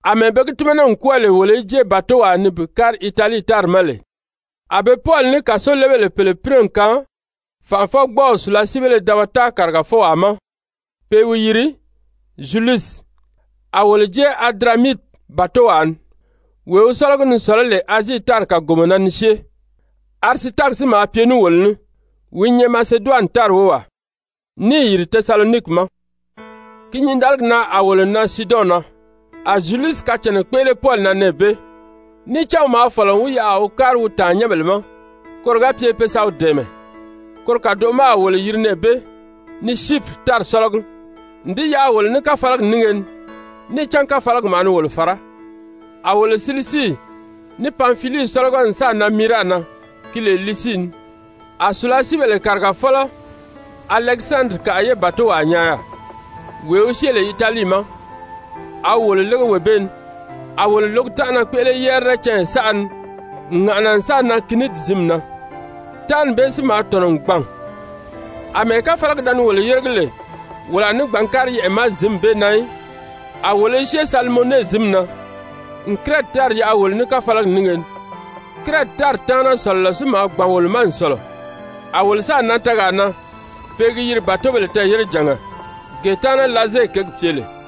Amɛɛ be gi tímana n kwɔ́ɔ lè wolo í jée bàtowaa ni bi kári Italii tári ma lè, a be Pɔli ní kàsolebèle pèle pínɛ n kaan fànʔafɔgbɔɔw sùlasiibéle dabata kàrigafɔwaa ma pe i wi yiri Zyulusi. A wolo jée Adiramiti bàtowaa ni, wee wi sɔ́lɔgi ni sɔ̀lɔ́ lè Azii tári kàgomɔ na ni syée, Arisitaki si maa pye ní wolo ní, wi i nyɛ Maseduwani tári wówaa, níì yìri Tesaloniki ma. Ki nyǐndaligi na a wolo nan Siidɔn na. A Zyulusi kacànna kpéʔele Pɔli na nɛɛ bee, níì cán wi maa fɔ̀lɔ n wi yaʔa a wi kári wi tàannyɛnbèle ma, koro ga pye pe sa wi dɛ̀ɛmɛ. Koro kàdoʔo ma a wolo yiri nɛɛ bee ni Syipiri tári sɔ́lɔgi n di yaʔa wolo ní káfalagi nínge ni, níì cán káfalagi maa ni wolo fàrá. A wolo Silisii ní Panfilii sɔ́lɔgɔ n sáà nan Miira na ki lè Lisii ni. A sùlasiibèle kàrigafɔlɔ Alɛkisandirikaʔa ye bàtowaa nyaa yaà, wee wi syée lè Italii ma, a wi wolo lége wee bee ni. A wolo lǒgi tánʔana kpéʔele yɛrirɛ canya saʔa ni n ŋàʔana n sáà nan Kiniidi zǐnmi na. Tánʔani bee si maa tɔ̀nɔ n gbàn, àmɛɛ káfalagi da ni wolo yéregi lè wolo a ní gbǎn kári yɛʔɛ̀ ma zǐnmi bee na í, a wolo i syée Salimone zǐnmi na n Kirɛti tári yaʔa wolo ní káfalagi nínge ni. Kirɛti tári taana sɔ̀lɔlɔ si maa gbàn wolo ma n sɔ̀lɔ, a wolo sáà nan tɛɛgaa na pe i gi yiri Bàtobèle Tɛɛ̀yérejànga, gee taana Laze kěgi pye lè.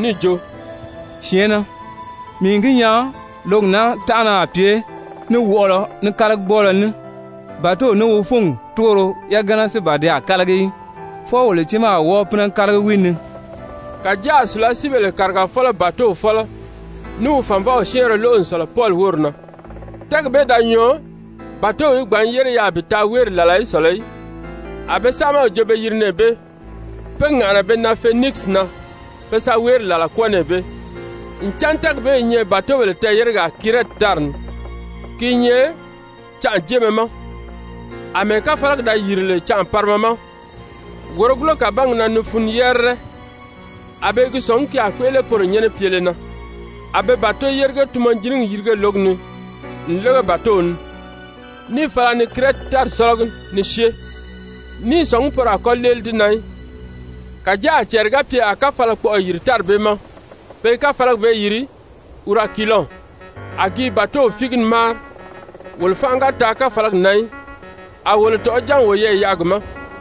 níì jo: «Syɛ̀ɛnnɛ, mii n gi nyaa lǒgi naa tánʔana a pye ní wɔʔɔlɔ, ní kálagigbɔɔlɔ ní, bàtow ní wi fúngi túgoro yagana si ban ti a kálagi í, fwɔɔ wolo tiimaa a wɔ́ɔ pínɛ kálagi wi ni.» Kàjáa a sùlasiibèle kàrigafɔlɔ bàtow fɔ́lɔ ní wi fànvɔw syɛ́ɛnrɛ lóʔo n sɔ̀lɔ Pɔli wóri na. Tɛ́ɛgi bee da nyɔɔ bàtow í gbǎn yére yaà bi taa wéeri làla í sɔ̀lɔ í, a be saamaw jo be yiri nɛɛ bee pe ŋàʔana be nan Fenikisi na pe sa wéeri làla kwɔ́ɔ nɛɛ bee, ncan tɛ́ɛgi bee i nyɛ bàtobèle tɛɛ̀yéregaa Kirɛti tári ni. Ki i nyɛ canʔajeemɛ ma. Amɛɛ káfalagi da yìri lè canʔa parima ma wòrogulo kàbangi na ni funu yɛrirɛ, a be i gi sɔ̀ngí ki a kpéʔele poro nyɛ́nɛ pyele na, a be bàto-yérige-tunmɔjinigi yirige lǒgi ni n lége bàtow ni, níì fala ni Kirɛti tári sɔ́lɔgi ni syée, ní i sɔ̀ngí poro a kɔ́ léeli di na í. Kàjáa a cɛɛri ga pye a káfalakpɔʔɔ yìri tári bee ma, pe i káfalagi bee yiri Urakilɔn. A gi i bàtow fíigi ni máari, wolo fánʔa ga taa káfalagi na í, a wolo tɔ̀ʔɔ́ ján n woyɛɛ yaʔa gi ma.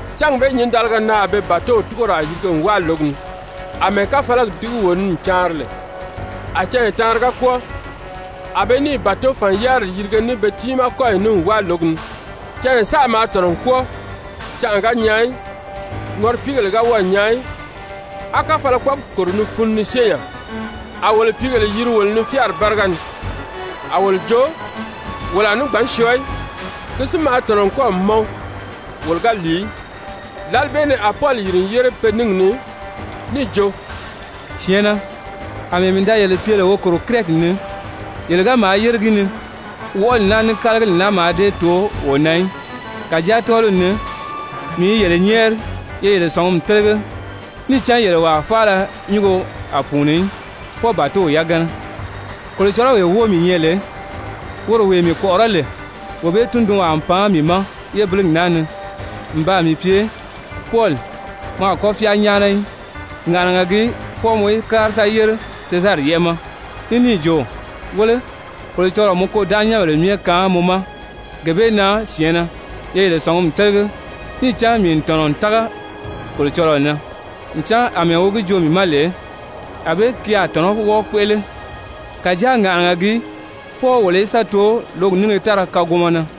Cángi bee nyǐndaliga na a be bàtow túgoraa yirige n wáa lǒgi ni, àmɛɛ káfalagi dígi wo ni n caanri lè, a canya taanri ga kwɔ́ɔ, a be níì bàtofan-yáriri yirige ní be tiimaa kɔ́yi ní n wáa lǒgi ni. Canya saʔa maa tɔ̀nɔ n kwɔ́ɔ, canʔa ga nyaa í, ŋɔripiigèlē ga wɔ́ɔ̀ nyaa í, á káfalakpɔɔgi kòro ni funu ni syée nya, a wolo pìígèle yiri wolo ni fyáari báriga ni, a wolo jo wolo a ní gbǎn syɔɔ í. Ki si maa tɔ̀nɔ n kɔ́ɔ̀ mɔn wolo ga lìi í. Lǎli bee ni a Pɔli yìri n yére pe níngi ni níì jo: «Syɛ̀ɛnnɛ, àmɛɛ mii da yele pye lè wo kòro Kirɛti ni, yele ga maa yére gi ni, wɔʔɔli naa, ní kálagili naa mǎà dée too wo na í. Kàjáa tɔ́ɔliw ni mii i yele nyɛ́ɛri ye yele sɔ̀ngumi télege, níì cán yele wàa faala nyúngo a pùuni í, fwɔɔ bàtow yagana. Kolocɔlɔwee wóo mii nyɛ lè, woro wee mii kpɔ̀ʔɔrɔ́ lè, wee bee tundunwaa n pan mii ma yébiligi naa ni n baa mii pye: ‹Pɔli, mɔ a kɔ́ fyáa nyáana í. Ŋàʔanaga gii fwɔɔ mɔ í kári sa yére Sezari yɛ́ʔɛ ma.› Ní níì jo: ‹Wéle, Kolocɔlɔɔ n mɔ kôdanʔanyɛnbèle myɛ kaan mɔ ma.› Gee bee na, syɛ̀ɛnnɛ, ye yele sɔ̀ngumi télege, níì cán mii n tɔ̀nɔ n tága Kolocɔlɔɔ na ncan àmɛɛ wi gi joo mii ma lè, ànbée ki a tɔ̀nɔ́ wɔ́ɔ kpéʔele. Kàjáa ŋàʔanaga gii fwɔɔ wolo í sa too lǒgi nínge táraa kàgomɔ na.»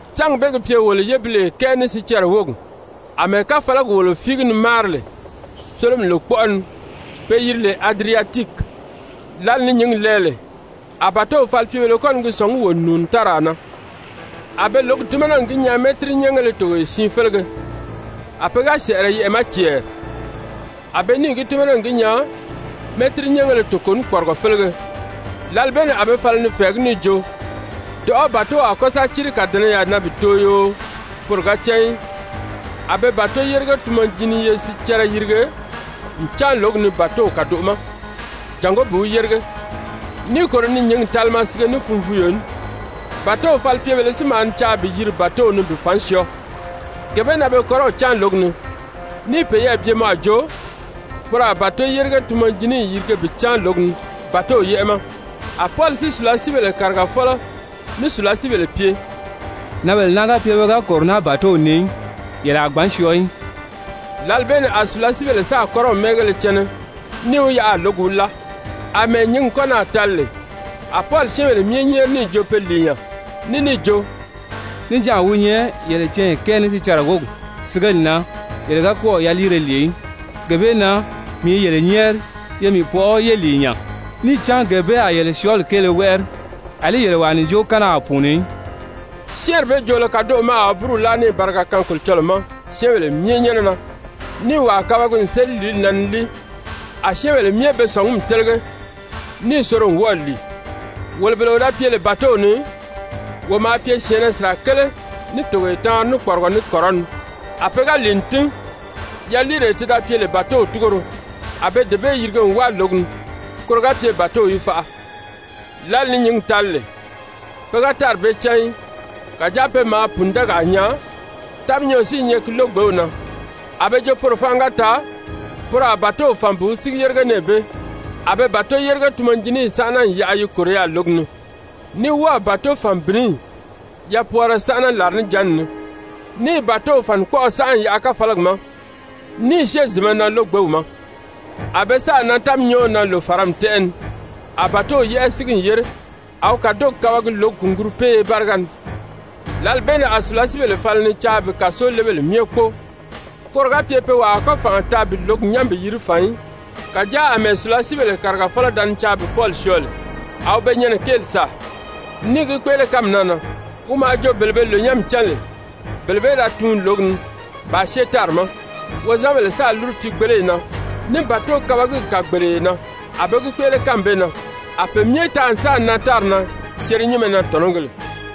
Cángi bee gi pye wolo yébiliye kɛɛ ní sicɛrɛ wógi àmɛɛ káfalagi wolo fíigi ni máari lè sólomi lòkpɔʔɔ ni pe yiri lè Adiriyatiki, lǎli ni nyǐngi lɛɛ lè, a bàtow falipyebèlē kɔ́ ni gi sɔ̀ngí wo n nùuni táraa na. A be lǒgi tímana n gi nyaa mɛ́tirinyɛngéle togoye siin félege. A pe ga sɛ̀ʔɛrɛ yɛʔɛ̀ ma cɛɛri, a be níì gi tímana n gi nyaa mɛ́tirinyɛngéle toko ní kpɔrigɔ félege. Lǎli bee ni a be fala ni fɛ̀ɛgí níì jo, dɔ̀ʔɔ́ bàtow a kɔ́ sa círi kàdɛnɛyaa na bi too yoo poro ga cán í. A be bàto-yérige-tunmɔjiniye sicɛrɛ yirige n cáan lǒgi ni bàtow kàdoʔo ma jàngó bi wi yérige, níì kòro ni nyǐngi talima sige ní funvuuyo ní. Bàtow falipyebèlē si maa ni caa bi yiri bàtow ni bi fàn syɔɔ, gee bee na be kɔ́rɔw cáan lǒgi ni níì peyɛɛ bye mɔ a jo poro a bàto-yérige-tunmɔjiniyi yirige bi cáan lǒgi ni bàtow yɛ́ʔɛ ma, a Pɔli si sùlasiibèle kàrigafɔlɔ ní sùlasiibèle pye: «Nǎnbèle naa ga pye pe ga kòro naa bàtow ni í, yele a gbǎn syɔɔ í.» Lǎli bee ni a sùlasiibèle sáà kɔ́rɔw mɛ́ɛngéle cɛnɛ níì wi yaʔa a lǒgi wi láa. Amɛɛ nyǐngi kɔ́ naà tali lè, a Pɔli syɛ́ɛnbèle myɛ nyɛ́ɛri níì jo pe lìi nya, ní níì jo: «Níjanʔa wi nyɛ yele canya kɛɛ ní sicɛrɛ wógi sigeli na yele ga kɔ́ɔ̀ yaliire lìi í. Gee bee na mii i yele nyɛ́ɛri, ye mii pɔʔɔ yé lìi nya, níì cán gee bee a yele syɔ́ɔli kéele wɛ́ʔɛri, àlí yele wàa ǹjookanna a pùuni í.» Syɛ́ɛnri bee joolo kadoʔo ma a wi búru láa níì bariga kaan Kolocɔlɔɔ ma syɛ́ɛnbèle myɛ nyɛ́nɛ na, níì wàa kabagi n séli lìíli na ni líi. A syɛ́ɛnbèle myɛ be sɔ̀ngumi télege, níì soro n wɔ́ɔ̀ lìi. Wolo bele wo da pye lè bàtow ni, wo maa pye syɛ̀ɛnnɛ sirakele ní togoye taanri ní kpɔrigɔ ní kɔrɔni. A pe ga lìi n tín, yaliiree ti da pye lè bàtow túgoro, a be dee bee yirige n wáa lǒgi ni koro ga pye bàtow í faʔa. Lǎli ni nyǐngi tali lè, pe ga tári bee cán í, kàjáa pe maa pùndɛɛgaa nyaa, táminyɔɔ si i nyɛ ki lógbew na, a be jo poro fánʔa ga taa, poro a bàtow fàn bi wi sígi yérige nɛɛ bee. A be bàto-yérige-tunmɔjiniyi sánʔana n yaʔa yi kòro yaà lǒgi ni, ní wɔ́ɔ̀ bàtofan-bìniyi yapwɔɔrɔ sánʔa làrinijanna ni, níì bàtow fànikpɔʔɔ sánʔa n yaʔa káfalagi ma, ní i syée zìnmɛ na lógbew ma. A be sáà nan táminyɔɔw na lòfarami tɛ́ʔɛ ni. A bàtow yɛ́ʔɛ sígi n yére, a wi kàdogi kabagi lǒgi kùngurupeeye báriga ni. Lǎli bee ni a sùlasiibèle fala ni caa bi kàsolebèle myɛ kpóo, koro ga pye pe wàa a kɔ́ fànʔa taa bi lǒgi nyán bi yiri fàn í. Kàjáa àmɛɛ sùlasiibèle kàrigafɔlɔ da ni caa bi Pɔli syɔɔ lè, a wi be nyɛnɛ kéeli sàa, níì gi kpéʔele kánmi naa na. Wi maa jo bele be lònyanmi cán lè bele bee í da tuun lǒgi ni bàā syée tári ma, wozanbèle sáā lúru tiigbeleyi na ní bàtokabagiw kàgbeleye na. A be gi kpéʔele kánmi bee na, a pe myɛ taa n sáà nan tári na cerenyinmɛ na tɔ̀nɔgēle.